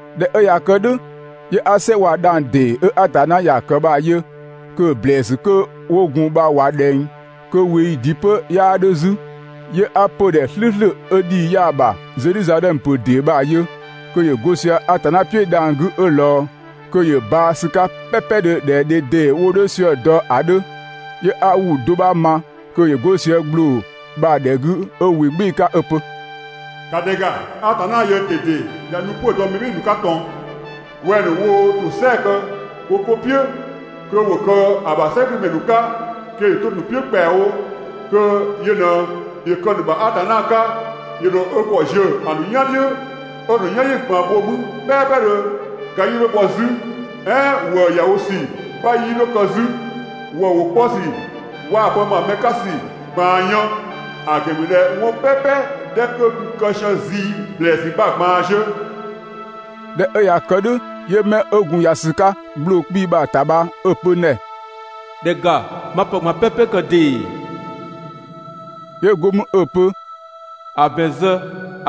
꞊Dhɛ 'ö ꞊ya kë "dhʋ̈, 'yö 'a "sɛ waa‑ dhang‑ ‑dee 'ö Atanna ‑ya kë bha‑ yö kö‑ ‑blɛɛsü ‑nu 'kö 'wo gun bha ꞊wa ꞊dhɛng, kö ꞊weeyi ‑dɩ 'pö 'yaa 'dhö 'zü. 'Yö 'a 'pödhɛ "slʋ̈ʋ̈slʋ̈ 'ö ‑dhii 'yaa‑ ‑bha, Zedhizadhɛmö ‑pö ‑dee bha‑ yö kö ‑yö 'go sië Atanna "piʋ̈ dhang‑ 'gü 'ö ꞊lɔɔ. Kö ‑yö baa‑ ‑sü 'ka "pɛpɛdhö ꞊dhɛ dhe ‑dee 'wo 'dho sië‑ dɔ ‑a 'dhö. 'Yö 'a ‑wʋ do 'bha ma kö ‑yö 'go sië ‑gbloo bha‑ ‑dhɛ 'gü 'ö ‑wɩ "gbɩɩ‑ 'ka 'ö‑ pö: «‑Ka ‑dhɛ ‑ga, Atanna yöö ꞊dede ꞊ya nu 'pö‑ dɔ mɛ "bhɩɩ‑ ‑nu 'ka ꞊tɔn! Wɛng‑ ‑nu woo ‑tosɛa kë wo 'ko "piʋ̈ kö ‑wo kë‑ ‑bha "sɛgümɛ ‑nu 'ka, kö ‑yö 'to‑ ‑nu "piʋ̈ ‑kpɛawo, kö yö ꞊në ‑yö kë‑ ‑nu ‑bha Atanna 'ka. ‑Yö ‑dho ö ‑kɔ ziö‑ ‑nu "yan "dhiʋ̈, 'ö‑ ‑nu "yanyi ꞊gban bho mü "pɛɛpɛdhö. Ga 'yii 'dho bhɔ 'zü, "ɛɛn ‑wëë ‑ya wo ‑sü 'bha 'yii 'dho kë 'zü, ‑wëë ‑wʋ 'kpɔ ‑sü waa‑ pë ‑ma mɛ 'ka ‑sü ꞊gbaan yën. ‑A ‑gɛn ‑mü ꞊dhɛ 'wɔn "pɛpɛ 'dhɛ 'kö gun kë sië zii ‑blɛɛsü bha‑ ꞊gbaan ziö.» ꞊Dhɛ 'ö ꞊ya kë "dhʋ̈, 'yö 'mɛ 'ö gun ‑ya ‑sü 'ka ‑gbloo 'kpii‑ bha‑ ‑ta bha 'ö‑ pö n ‑dhɛ: «‑Dhɛ ‑ga, 'ma pë ꞊gban "pɛpɛ kë ‑dee.» 'Yö go mü 'ö‑ pö: «‑A ‑bɛn zë,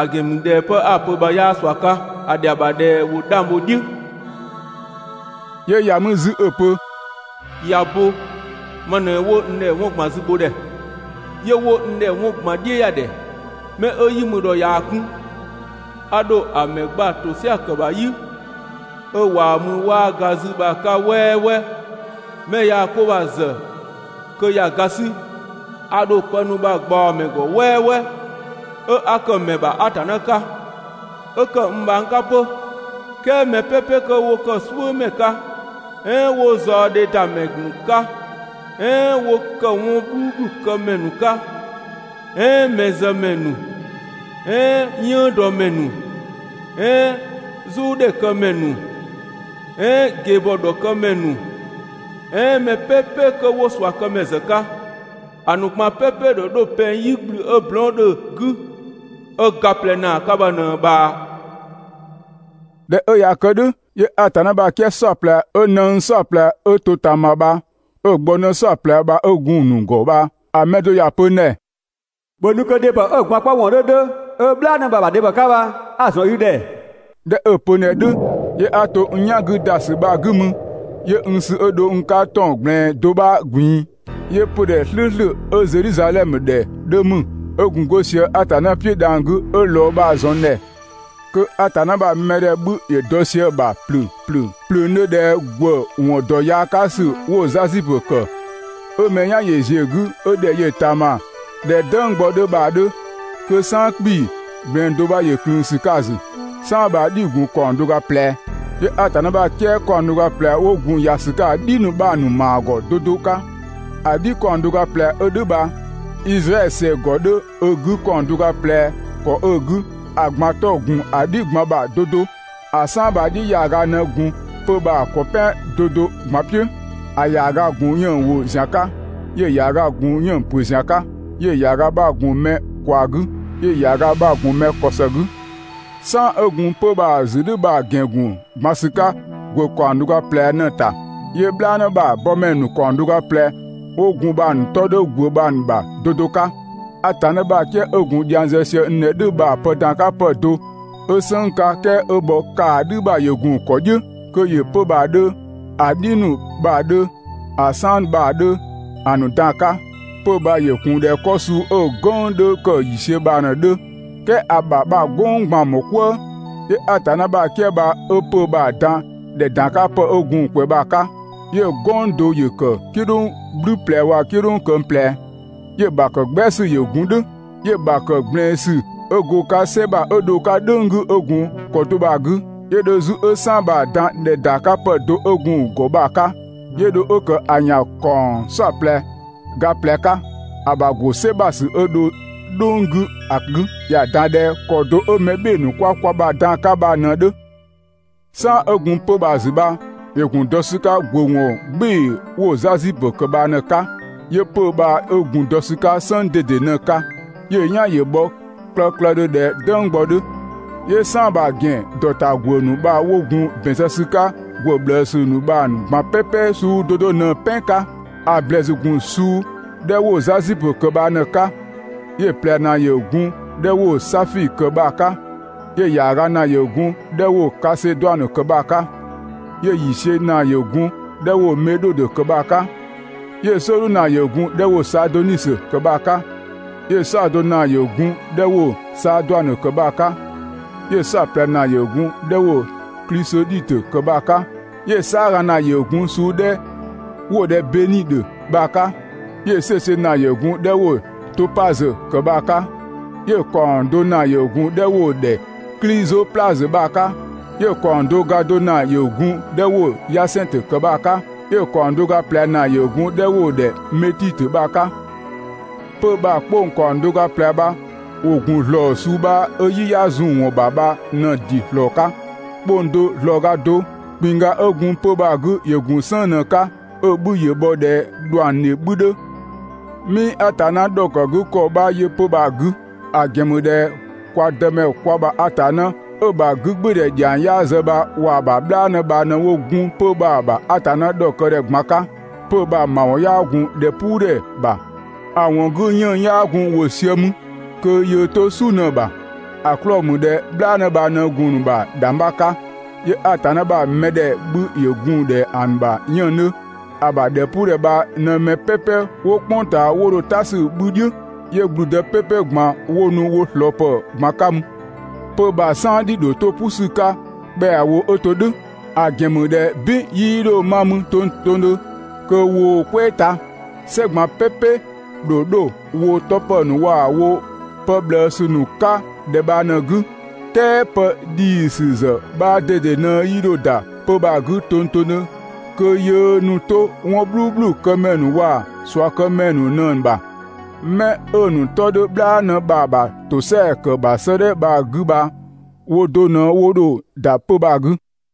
‑a ‑gɛn ‑mü ꞊dhɛ 'pë 'a‑ pö bha 'yaa ꞊sua 'ka, ‑a ‑dhɛa ‑bha ꞊dhɛ ‑wo 'dhang bho‑ "dhiʋ̈. 'Yö ‑ya mü 'zü 'ö‑ pö: «꞊Ya bo! Ma ꞊në 'wo n ‑dhɛ 'wɔn ꞊gban zübhodhɛ, 'yö 'wo n ‑dhɛ 'wɔn ꞊gban "dhiʋ̈yadhɛ. 'Mɛ 'ö "yi mü ‑dhɔ ꞊yaa‑ 'kun, a ‑dho ‑a ‑mɛ gba ‑tosɛa ‑kë ‑bha "yi 'ö ꞊waa‑ mü 'waa ga 'zü bha‑ 'ka "wɛɛwɛɛ. 'Mɛ 'ö yaa‑ 'ko bha‑ ‑zë kö ‑ya ga 'sü, a ‑dho pë ‑nu bha‑ ꞊gbaɔ‑ ‑mɛ ‑gɔ "wɛɛwɛɛ, 'ö 'a ‑kë ‑mɛ ‑bha Atanna 'ka, 'ö ‑kë n bhang 'ka 'pö. "Kɛɛ mɛ "pɛpɛ 'kö 'wo "suʋ̈mɛ 'ka, "ɛɛn 'ö 'wo zaɔdhedamɛ ‑nu 'ka, "ɛɛn 'ö 'wo ‑kë 'wɔn "bhluubhlu këmɛ ‑nu 'ka, "ɛɛn mɛzëmɛ ‑nu, "ɛɛn "yënngdɔmɛ ‑nu, "ɛɛn "zʋʋdhɛ këmɛ ‑nu, "ɛɛn ꞊gebhɔ ‑dhɔkëmɛ ‑nu "ɛɛn mɛ "pɛpɛ 'dhɛ 'kö 'wo ꞊suakëmɛ ‑zë 'ka, ‑a ‑nu ꞊gban "pɛpɛ‑ ‑dho 'dho pɛng "yigblü 'ö blɔɔn" 'dhö‑ 'gü, 'ö ga ꞊plɛ ‑naa 'ka bha ꞊në‑ ꞊bhaa.» ꞊Dhɛ 'ö ꞊ya kë "dhʋ̈, 'yö Atanna ‑bha "kië "saɔplɛ 'ö ꞊nëng "saɔplɛ 'ö to ꞊taama bha 'ö‑ gbɔnë "saɔplɛ bha 'ö gun‑ ‑nu ‑gɔ bha‑ mɛ do ‑ya pö n ‑dhɛ: «‑Bhö nu kö dhebhɔ 'ö‑ gwaan‑ 'kpɔ ‑wɔn 'dhö 'dhö, 'ö "bhlaanë bha‑ ‑bha dhebhɔ 'ka bha 'a‑ ‑zɔn i ‑dhɛ.» ꞊Dhɛ 'ö‑ pö n ‑dhɛ "dhʋ̈, 'yö 'a to n "yan 'gü ‑da ‑sü bha‑ 'gü mü 'yö n sü 'ö dho n 'ka ‑tɔn ꞊gblɛɛn do 'bha ꞊gbin‑, 'yö 'pödhɛ "slʋ̈ʋ̈slʋ̈ 'ö‑ Zedhizadhɛmö ‑dhɛ 'dhö ‑mü, 'ö gun 'go sië Atanna "piʋ̈ dhang‑ 'gü 'ö ꞊lɔɔ bha‑ ‑zɔn n ‑dhɛ. Kö Atanna ‑bha mɛ ‑dhɛ 'bhü ‑yö dɔ sië‑ ‑bha ‑plöng ‑plöng ‑plöngdhö ꞊dhɛ ‑gwë ‑wɔn ‑dɔ yaa 'ka ‑sü ‑nu 'wo‑ 'zasipö ‑kë, 'ö mɛ "yan ‑yö ‑ziö 'gü 'ö ‑dhɛ yö‑ ꞊taama ꞊dhɛ "dënggbɔ 'dhö bha‑ 'dhö. Kö "saan 'kpii‑, ꞊gblɛɛn do 'bha ‑yö ꞊klëën ‑sü 'ka‑ ‑zü. "Saan bha‑ "dhi‑ ‑gun ‑kaɔng do ga ꞊plɛ. 'Yö Atanna ‑bha "kië ‑kaɔng do ga ꞊plɛ 'wo gun ‑ya ‑sü 'ka ‑a "dhi ‑nu bha‑ ‑nu ‑maa ‑gɔ 'do 'do 'ka. ‑A "dhi ‑kaɔng do ga ꞊plɛ 'ö "dhʋ̈ bha, Izraɛdhö ‑sɛ ‑gɔ 'dhö ö 'gü ‑kaɔng do ga ꞊plɛ ‑kɔ 'ö‑ 'gü, ‑a ꞊gban 'tɔ‑ ‑gun ‑a "dhi ꞊gban ‑bha 'do 'do. ‑A "saan bha‑ "dhi ‑yaaga ꞊në gun 'pö‑ bha‑ ‑kɔ "pɛan 'do 'do ꞊gban "piʋ̈. ‑A ‑yaaga ‑gun 'yënng‑ ‑wo ‑zian 'ka, 'yö‑ ‑yaaga gun 'yënng‑ ‑pö ‑zian 'ka, 'yö‑ ‑yaaga 'bha‑ gun mɛ ꞊kwaa 'gü, 'yö‑ ‑yaaga 'bha‑ gun mɛ ‑kɔ ‑së 'gü. "Saan 'ö gun 'pö‑ bha‑ ‑zü "dhʋ̈ bha‑ ‑gɛn ‑gun ‑gban ‑sü 'ka ‑gwë ‑kaɔng do ga ꞊plɛ ꞊në‑ ‑ta, 'yö "bhlaanë ‑bha bɔmɛ ‑nu ‑kaɔng do ga ꞊plɛ 'wo gun bha‑ ‑nu 'tɔ 'dhö ‑gwë bha‑ ‑bha 'do 'do 'ka. Atanna ‑bha "kië 'ö gun dhiang zë sië n ‑dhɛ "dhʋ̈ bha pë ‑dan 'ka pë do, 'ö "sënng 'ka, "kɛɛ 'ö bhɔ ‑kaadhü ‑bha ‑yö ‑gun ‑kɔ "dhiʋ̈, kö ‑yö 'pö‑ bha‑ 'dhö, ‑a "dhi ‑nu bha‑ 'dhö, ‑a "saan bha‑ 'dhö, ‑a ‑nu dan‑ 'ka. 'Pö‑ bha ‑yö gun ꞊dhɛ 'kɔ suu 'ö "gwënng 'dhö ‑kë ‑yiisiö bha ꞊në‑ 'dhö, "kɛɛ ‑a ‑bha bha‑ "gwënng ꞊gban‑ ‑mɔɔ "kwëë. 'Yö Atanna ‑bha "kië bha 'ö‑ 'pö‑ bha‑ dan ‑dhɛ ‑dankapë 'ö gun‑ ꞊kwɛɛ bha‑ 'ka. 'Yö‑ "gwënng do ‑yö ‑kë "kidhʋng "gblü ꞊plɛ waa‑ "kidhʋng këng ꞊plɛ, 'yö‑ ‑bha ‑kë "gbɛa ‑sü ‑yö ‑gun "dhʋ̈, 'yö‑ ‑bha ‑kë ꞊gblɛɛn ‑sü 'ö go‑ 'ka "sɛ ‑bha 'ö dho‑ 'ka "dhʋ̈ng 'gü 'ö gun ‑kɔ do bha‑ 'gü. 'Yö dho 'zü 'ö "saan bha‑ dan ‑dhɛ ‑dankapë do 'ö gun‑ ‑gɔ bha‑ 'ka, 'yö dho 'ö ‑kë ‑a ‑yan ‑kaɔng "saɔplɛ ga ꞊plɛ 'ka, ‑a ‑bha ‑go "sɛ ‑bha ‑sü 'ö dho "dhʋ̈ng 'gü ‑a 'gü. ‑Ya ‑dan ꞊dhɛ ‑kɔ do 'ö mɛ "bhɩɩ‑ ‑nu 'kwa kwa ‑bha dan‑ 'ka bha ꞊në‑ 'dhö. "Saan 'ö gun 'pö‑ bha‑ ‑zü bha ‑yö gun dɔ ‑sü 'ka ‑gwë ‑wɔn "gbɩɩ‑ 'wo‑ 'zasipö ‑kë bha ꞊në‑ 'ka, 'yö 'pö‑ 'kö bha 'ö gun dɔ ‑sü 'ka "sënng ꞊dede ꞊në‑ 'ka, 'yö‑ "yan ‑yö bhɔ klëklëdhö ꞊dhɛ "dënggbɔ 'dhö. 'Yö‑ "saan bha‑ ‑gɛn ‑dɔ ‑ta ‑gwë ‑nu bha 'wo gun‑ ‑bɛn zë ‑sü 'ka ‑gwë ꞊bhlëësü ‑nu bha‑ ꞊gban "pɛpɛ suu 'do 'do ꞊në‑ "pɛn 'ka. ‑A ‑blɛɛsü ‑gun suu 'dhɛ 'wo‑ zasipö ‑kë bha ꞊në‑ 'ka, 'yö‑ ꞊plɛ ‑naa ‑yö gun‑ 'dhɛ 'wo‑ safii‑ ‑kë bha‑ 'ka, 'yö‑ ‑yaaga ‑naa ‑yö gun‑ 'dhɛ 'wo kaseduanö kë bha‑ 'ka, 'yö‑ ‑yiisiö ‑naa ‑yö gun‑ 'dhɛ 'wo‑ medhodö ‑kë bha‑ 'ka; 'Yö‑ "sɔɔdhu ‑naa ‑yö gun‑ 'dhɛ 'wo‑ saadonisö ‑kë bha‑ 'ka, 'yö‑ "saɔdo ‑naa ‑yö gun‑ 'dhɛ 'wo‑ saaduanö ‑kë bha‑ 'ka, 'yö‑ "saɔplɛ ‑naa ‑yö gun‑ 'dhɛ 'wo‑ klisodhitö ‑kë bha‑ 'ka, 'yö‑ "saaga ‑naa ‑yö gun‑ suu 'dhɛ 'wo‑ ‑dhɛ bedhidö bha‑ 'ka, 'yö‑ "sueisiö ‑naa ‑yö gun‑ 'dhɛ 'wo‑ topazö ‑kë bha‑ 'ka, 'yö‑ ‑kaɔng do ‑naa ‑yö gun‑ 'dhɛ 'wo‑ ‑dhɛ klizoplazö bha‑ 'ka, 'yö‑ ‑kaɔng do ga do ‑naa ‑yö gun‑ 'dhɛ 'wo‑ yasɛnngtö ‑kë bha‑ 'ka, 'yö‑ ‑kaɔng do ga ꞊plɛ ‑naa ‑yö gun‑ 'dhɛ 'wo‑ ‑dhɛ metitö bha‑ 'ka. 'Pö‑ bha‑ 'kpong ‑kaɔng do ga ꞊plɛ bha ‑wo ‑gun ‑zlɔɔ suu 'bha 'ö "yi 'yaa zun‑ ‑wɔn ‑bha bha ꞊në‑ ‑dɩ ‑slɔɔ 'ka. 'Kpong do ‑zlɔɔga do. ‑Kpinngga 'ö gun 'pö‑ bha‑ 'gü ‑yö gun "sënng ꞊në‑ 'ka, 'ö‑ 'bhü ‑yö bhɔ ꞊dhɛ ‑dhuangdhe 'bhü 'dhö. 'Mii Atanna ‑dhɔkëgükɔ 'bha yö 'pö‑ bha‑ 'gü, ‑a ‑gɛn ‑mü ꞊dhɛ kwa Dëmɛ kwa ‑bha Atanna 'ö‑ ‑bha 'gügbɩɩdhɛ ‑dhiang 'yaa zë bha waa‑ ‑bha "bhlaanë bha ꞊në 'wo gun 'pö‑ bha‑ ‑bha Atanna ‑dhɔkë ‑dhɛ ꞊gban 'ka. 'Pö‑ bha‑ ‑mawɔn 'yaa gun ‑dhɛpuudhɛ ‑bha, ‑a ‑wɔn 'gü 'yënng‑ 'yaa gun ‑wo sië mü, kö yöö 'to "su ꞊në‑ ‑bha. ‑A 'klɔɔ‑ ‑mü ꞊dhɛ "bhlaanë bha ꞊në gun‑ ‑bha ‑dhangbha 'ka, 'yö Atanna ‑bha mɛdhɛ 'bhü ‑yö gun ꞊dhɛ ‑a ‑bha 'yënng‑ 'dhö. ‑A ‑bha ‑dhɛpuudhɛ bha ꞊në mɛ "pɛpɛ 'wo "kpʋng ꞊taa 'wo dho "ta 'sü‑ 'bhü "dhiʋ̈, 'yö ‑gblüdë "pɛpɛ ꞊gban 'wo nu wo ꞊slɔɔ ‑pë ꞊gban 'ka mü. 'Pö‑ bha‑ "saan "dhi‑ ‑dho 'to "pʋ ‑sü 'ka ‑kpɛawo 'ö to "dhʋ̈, ‑a ‑gɛn ‑mü ꞊dhɛ "bin 'yii 'dho 'ma mü tongtongdhö kö woo‑ "kwɛɛ ta. "Sɛ ꞊gban "pɛpɛ‑ ‑dho 'dho woo‑ 'tɔ ‑pë ‑nu waa‑ woo‑ pë ꞊bhlëësü ‑nu 'ka ‑dhɛ bha ꞊në‑ 'gü. "Kɛɛ pë ‑dhiisü ‑zë 'bha ꞊dede ꞊në 'yii 'dho ‑da 'pö‑ bha‑ 'gü tongtongdhö kö yöö ‑nu 'to 'wɔn "bhluubhlu këmɛ ‑nu waa‑ ꞊suakëmɛ ‑nu ꞊në‑ ‑bha. 'Mɛ 'ö‑ ‑nu 'tɔ 'dhö "bhlaanë bha‑ ‑bha ‑tosɛa ‑kë ‑bha 'sëëdhɛ bha‑ 'gü bha woo do ꞊në 'wo dho ‑da 'pö‑ bha‑ 'gü.